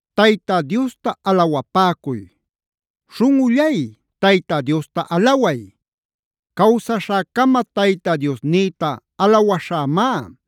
Tayta Diosta alawapäcuy. ¡Śhunꞌullay, Tayta Diosta alaway! Cawsaśhäcama Tayta Diosnïta alawaśhämá.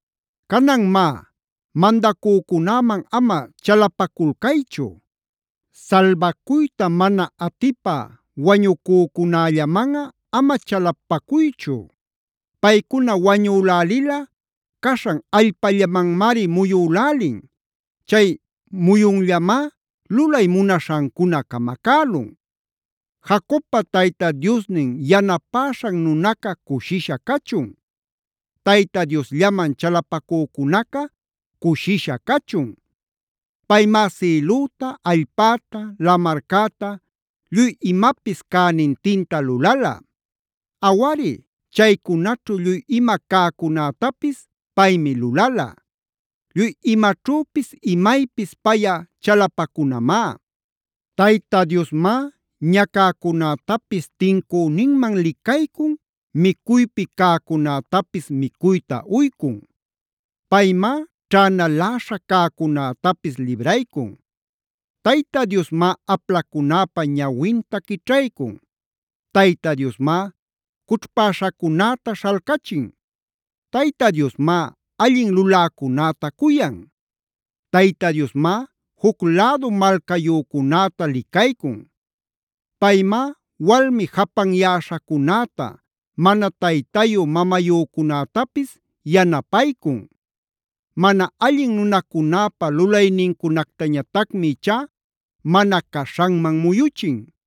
Canan má, mandacücunäman ama chalapaculcaychu. Salbacuyta mana atipä wañucücunällamanꞌa ama chalapacuychu. Paycuna wañülälilꞌa caśhan allpallamanmari muyülälin. Chay muyunllamá lulay munaśhancuna camacälun. Jacobpa Tayta Diosnin yanapäśhan nunaca cushisha cachun. Tayta Diosllaman chalapacücunaca cushisha cachun. Paymá sïlüta, allpäta, lamarcäta lluy imapis cänintinta lulala. Awari chaycunaćhu lluy ima cäcunätapis paymi lulala.b Lluy imaćhüpis imaypis payꞌa chalapacunamá. Tayta Diosmá ñacäcunätapis tincüninman licaycun,c micuypi cäcunätapis micuyta uycun. Paymá ćhänaläśha cäcunätapis libraycun. Tayta Diosmá aplacunäpa ñawinta quićhaycun. Tayta Diosmá cućhpäśhacunäta śhalcachin. Tayta Diosmá allin luläcunäta cuyan. Tayta Diosmá juc lädu malcayücunäta licaycun. Paymá walmi japanyäśhacunäta, mana taytayu mamayücunätapis yanapaycun. Mana allin nunacunäpä lulaynincunactañatacmi ichá mana caśhanman muyuchin.